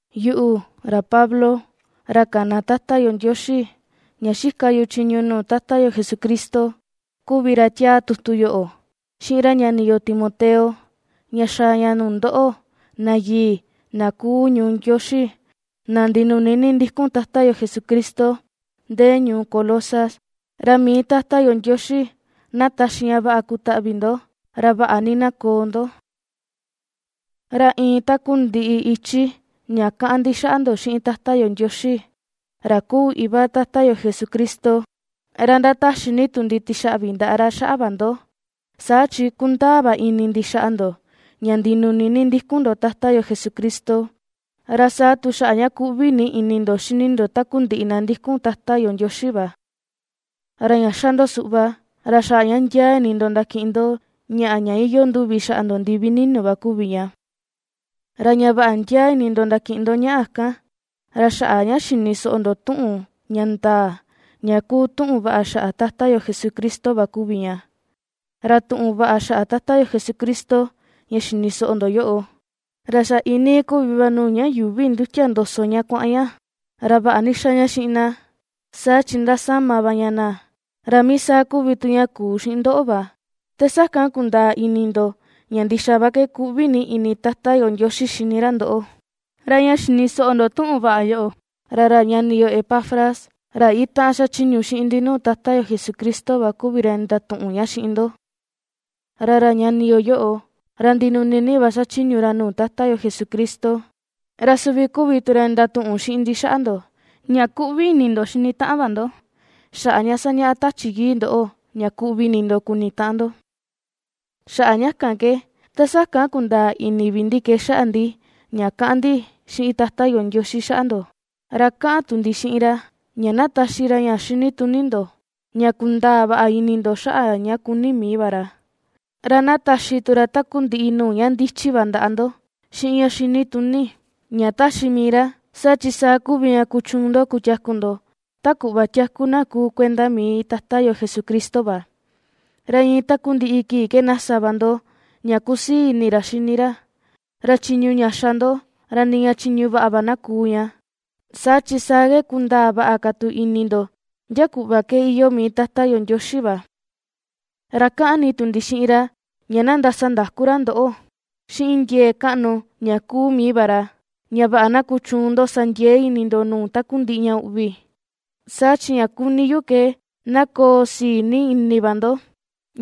Yuꞌu, ra Pablo, ra kana Tata yo Ndioxi, ña xika yu chiñu nuu Tata yo Jesucristo kuvi ra ^tiaa tutu yoꞌo, xiꞌin ra ñani yo Timoteo, ña xaa ña nuu ndoꞌo, na yii na kuu ñuu Ndioxi, na ndinuni ni ndikun Tata yo Jesucristo ndee ñuu Colosas. Ra mii Tata yo Ndioxi na taxi ña vaꞌa kutaꞌvi ndo, ra vaꞌa ni na koo ndo. Ra iin takundiꞌi ichi ña kaꞌan ndi xaꞌa ndo xiꞌin Tata yo Ndioxi, ra kuu iva Tata yo Jesucristo, ra ndataxi ni tu ndi tixaꞌvi ndaꞌa ra xaꞌa va ndo. Saa chi ^kundaa va ini ndi xaꞌa ndo ña ndinuni ni ndikun ndo Tata yo Jesucristo, ra saa tu xaꞌa ña kuꞌvi ni ini ndo xini ndo takundiꞌi na ndikun Tata yo Ndioxi va. Ra ña ^xa ndo suꞌva, ra xaꞌa ña ndiaa ini ndo ndakiꞌin ndo ñaꞌa ña iyoo nduvi xaꞌa ndo ndivi ninu va kuvi ña. Ra ña vaꞌa ndiaa ini ndo ndakiꞌin ndo ñaꞌa kan, ra xaꞌa ña xini soꞌo ndo tuꞌun ña ndaa, ña kuu tuꞌun vaꞌa xaꞌa Tata yo Jesucristo va kuvi ña. Ra tuꞌun vaꞌa xaꞌa Tata yo Jesucristo ña xini soꞌo ndo yoꞌo, ra xa iinii kuvi va nuu ña yuuvi ndutia ndoso ña kuaꞌan ña, ra vaꞌa ni xa ña xiꞌin na, saa chi ndasama va ña na. Ra mii saa kuvi tu ña kuu xiꞌin ndoꞌo va, te sakan kundaa ini ndo ña ndixa va ke kuꞌvi ni ini Tata yo Ndioxi ^xini ra ndoꞌo. Ra ña xini soꞌo ndo tuꞌun vaꞌa yoꞌo, ra ra ñani yo Epafras, ra itaꞌan xachiñu xiꞌin ndi nuu Tata yo Jesucristo va kuvi ra ndatuꞌun ña xiꞌin ndo. Ra ra ñani yo yoꞌo, ra ndinuni va xachiñu ra nuu Tata yo Jesucristo. Ra suvi kuvi tu ra ndatuꞌun xiꞌin ndi xaꞌa ndo, ña kuꞌvi ini ndo xini taꞌan va ndo, xaꞌa ña sañaꞌa Tachi Yii ndoꞌo ña kuꞌvi ini ndo kuni taꞌan ndo. Xaꞌa ña kan ke, ta sakan kundaa ini vi ndi ke xaꞌa ndi ña kaꞌan ni ndi xiꞌin Tata yo Ndioxi xaꞌa ndo, ra kaꞌan tu ndi xiꞌin ra ña na taxi ra ña xinituni ndo, ña kundaa vaꞌa ini ndo xaꞌa ña kuni mii va ra, ra na taxi tu ra takundiꞌi nuu ña ndichi va ndaꞌa ndo, xiꞌin ña xinituni, ña taxi mii ra. Saa chi saa kuvi ña kuchuun ndo kutiaku ndo, ta kuꞌva tiaku na kuu kuenda mii Tata yo Jesucristo va, ra iin takundiꞌi kii ke na sa va ndo ña kusii ini ra xini ra, ra chiñu ña xa ndo, ra niña chiñu vaꞌa va na kuu ña, saa chi saa ke kundaa vaꞌa ka tu ini ndo ndia kuꞌva ke iyoo mii Tata yo Ndioxi va. Ra kaꞌan ni tu ndi xiꞌin ra ña na ndasandaku ra ndoꞌo xiꞌin ndiee kaꞌnu ña kuu mii va ra, ña vaꞌa na kuchuun ndo sa ndiee ini ndo nuu takundiꞌi ña uꞌvi, saa chi ña kuni yu ke na koo sii ni ini va ndo,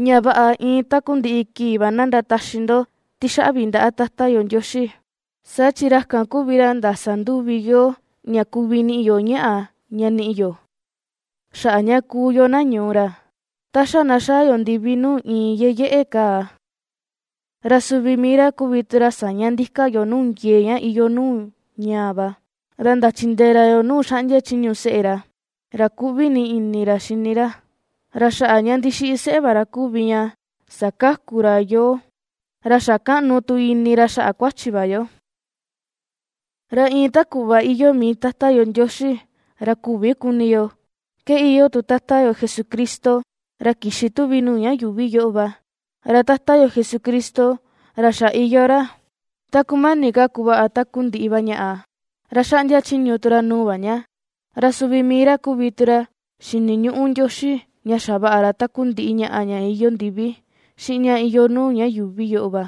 ña vaꞌa iin takundiꞌi kii va na ndataxi ndo tixaꞌvi ndaꞌa Tata yo Ndioxi. Saa chi ra kan kuvi ra ndasa nduvi yoo ña kuvi niꞌi yo ñaꞌa ña niꞌi yo, xaꞌa ña kuu yo na ñuu ra, ta xa na xaa yo ndivi nuu iin yeyeꞌe kaa. Ra suvi mii ra kuvi tu ra saña ndika yoo nuu ndiee ña iyoo nuu ñaa va, ra ndachindee ra yoo nuu xaꞌndia chiñu seꞌe ra, ra kuꞌvi ni ini ra xini ra. Ra xaꞌa ña ndixiꞌi seꞌe va ra kuvi ña sakaku ra yoo, ra xa kaꞌnu tu ini ra xaꞌa kuachi va yo. Ra iin ta kuꞌva iyoo mii Tata yo Ndioxi, ra küvi kuni yo, ke iyoo tu Tata yo Jesucristo ra kixi tuvi nuu ña yuuvi yoꞌo va. Ra Tata yo Jesucristo, ra xa iyoo ra, ta kumani ka kuvaꞌa takundiꞌi va ñaꞌa, ra ^xaꞌndia chiñu tu ra nuu va ña. Ra suvi mii ra kuvi tu ra xiniñuꞌu Ndioxi ña xavaꞌa ra takundiꞌi ñaꞌa ña iyoo ndivi, xiꞌin ña iyoo nuu ña yuuvi yoꞌo va,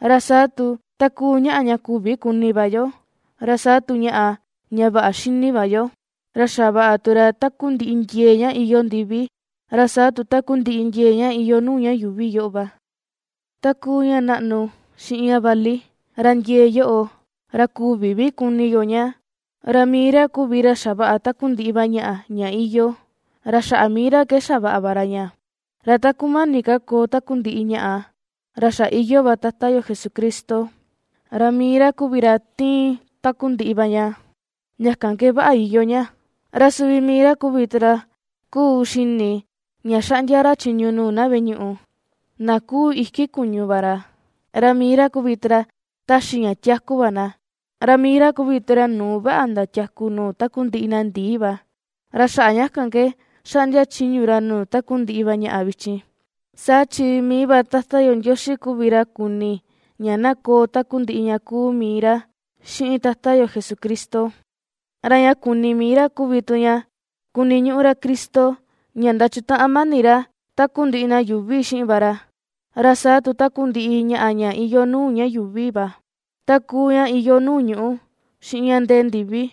ra saa tu, ta kuu ñaꞌa ña küvi kuni va yo, ra saa tu ñaꞌa ña vaꞌa xini va yo. Ra xavaꞌa tu ra tankundiꞌi ndiee ña iyoo ndivi, ra saa tu takundiꞌi ndiee ña iyoo nuu ña yuuvi yoꞌo va, ta kuu ña naꞌnu xiꞌin ña vali, ra ndiee yoꞌo, ra küvi vi kuni yo ña, ra mii ra kuvi ra xavaꞌa takundiꞌi va ñaꞌa ña iyoo, ra xaꞌa mii ra ke xavaꞌa va ra ña. Ra ta kumani ka koo takundiꞌi ñaꞌa, ra xa iyoo va Tata yo Jesucristo, ra mii ra kuvi ra ^tiin takundiꞌi va ña, ña kan ke vaꞌa iyoo ña. Ra suvi mii ra kuvi tu ra, kuu xini ña xaꞌndia ra chiñu nuu na veꞌe ñuꞌu, na ^kuu iki kuñu va ra. Ra mii ra kuvi tu ra, ^taxi ña tiaku va na, ra mii ra kuvi tu ra nuu vaꞌa ndatiaku nuu takundiꞌi na ndii va, ra xaꞌa ña kan ke ^xaꞌndia chiñu ra nuu takundiꞌi va ñaꞌa vichin. Saa chi mii va Tata yo Ndioxi kuvi ra kuni ña na koo takundiꞌi ña kuu mii ra xiꞌin Tata yo Jesucristo. Ra ña kuni mii ra kuvi tu ña, kuniñuꞌu ra Cristo ña ndachutaꞌan mani ra takundiꞌi na yuuvi xiꞌin va ra, ra saa tu takundiꞌi ñaꞌa ña iyoo nuu ña yuuvi va, ta kuu ña iyoo nuu ñuꞌu, xiꞌin ña ndee ndivi.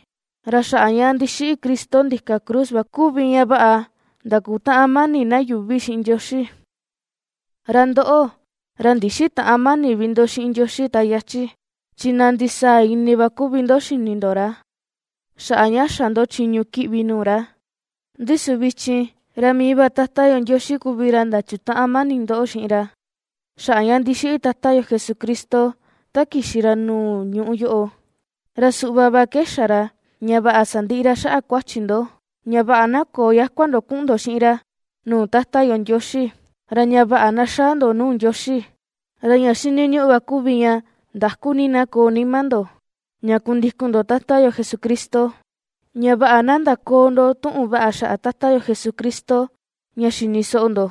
Ra xaꞌa ña ndixiꞌi Cristo ndika cruz va kuvi ña vaꞌa ndakutaꞌan mani na yuuvi xiꞌin Ndioxi. Ra ndoꞌo, ra ndixitäꞌan mani vi ndo xiꞌin Ndioxi ta yachi, chi na ndisaa ini va kuvi ndo xini ndo ra, xaꞌa ña xa ndo chiñu kiꞌvi nuu ra; ndi su vichin, ra mii va Tata yo Ndioxi kuvi ra ndachutaꞌan mani ndoꞌo xiꞌin ra, xaꞌa ña ndixiꞌi Tata yo Jesucristo ta kixi ra nuu ñuꞌu yoꞌo. Ra suꞌva va ke xa ra ña vaꞌa sandiꞌi ra xaꞌa kuachi ndo, ña vaꞌa na köo yakua ndo kuꞌun ndo xiꞌin ra, nuu Tata yo Ndioxi; ra ña vaꞌa na xaa ndo nuu Ndioxi, ra ña xiniñuꞌu va kuvi ña ndaku ni na koo nima ndo, ña kundikun ndo Tata yo Jesucristo, ña vaꞌa na ndaköo ndo tuꞌun vaꞌa xaꞌa Tata yo Jesucristo ña xini soꞌo ndo.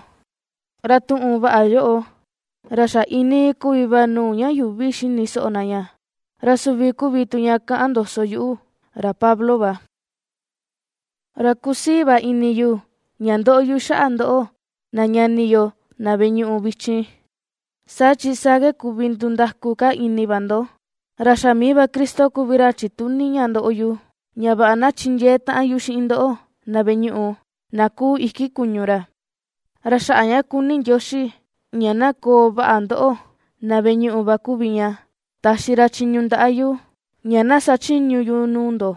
Ra tuꞌun vaꞌa yoꞌo, ra xa iinii kuvi va nuu ña yuuvi xini soꞌo na ña, ra suvi kuvi tu ña kaꞌan ndoso yuꞌu, ra Pablo va. Ra kusii va ini yu ña ndóꞌó yu xaꞌa ndóꞌo, na ñani yo, na veꞌe ñuꞌu, vichin, saa chi saa ke kuvi ndundaku ka ini va ndo, ra xa mii va Cristo kuvi ra chituni ña ndoꞌo yu, ña vaꞌa na chindiee taꞌan yu xiꞌin ndoꞌo na veꞌe ñuꞌu, na kuu iki kuñu ra. Ra xaꞌa ña kuni Ndioxi ña na koo vaꞌa ndoꞌo, na veꞌe ñuꞌu va kuvi ña, taxi ra chiñu ndaꞌa yu, ña na sachiñu yu nuu ndo,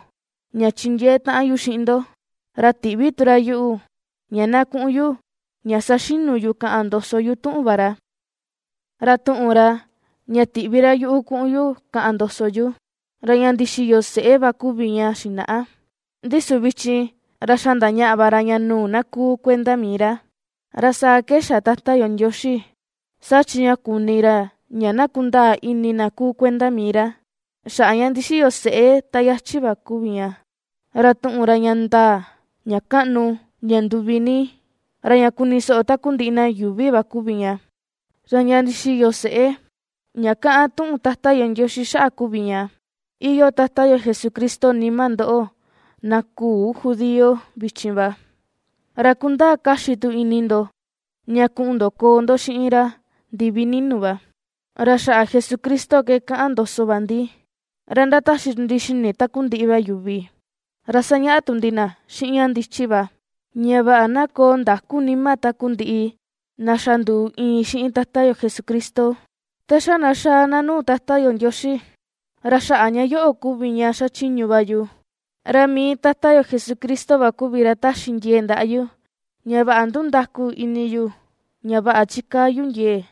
ña chindiee taꞌan yu xiꞌin ndo, ra tiꞌvi tu ra yuꞌu, ña na kuꞌun yu ña saxinu yu kaꞌan ndoso yu tuꞌun va ra. Ra tuꞌun ra, ña tiꞌvi ra yuꞌu kuꞌun yu kaꞌan ndoso yu, ra ña ndixiyo seꞌe va kuvi ña xinaꞌa, ndi su vichin, ra xa ndañaꞌa va ra ña nuu na kuu kuenda mii ra. Ra saa ke xa Tata yo Ndioxi, saa chi ña kuni ra ña na kundaa ini na kuu kuenda mii ra, xaꞌa ña ndixiyo seꞌe ta yachi va kuvi ña. Ra tuꞌun ra ña ndaa, ña kaꞌnu, ña nduvi ni, ra ña kuni soꞌo takundiꞌi na yuuvi va kuvi ña. Ra ña ndixiyo seꞌé ña kaꞌan tuꞌun Tata yo Ndioxi xaꞌa kuvi ña: iyoo Tata yo Jesucristo nima ndoꞌo na küu judío vichin va, ra kundaa kaxi tu ini ndo ña kuꞌun ndo koo ndo xiꞌin ra ndivi ninu va. Ra xaꞌa Jesucristo ke kaꞌan ndoso va ndi. Ra ^ndataxi tu ndi xini takundiꞌi va yuvi, ra ^sañaꞌa tu ndi na xiꞌin ña ndichi va, ña vaꞌa na koo ndakú nima takundiꞌi na xa nduu iin xiꞌin Tata yo Jesucristo, ta xa na xaa na nuu Tata yo Ndioxi. Ra xaꞌa ña yoꞌo kuvi ña xachiñu va yu, ra mii Tata yo Jesucristo va kuvi ra ^taxi ndiee ndaꞌa yu, ña vaꞌa ndundaku ini yu ña vaꞌa chikaa yu ndiee.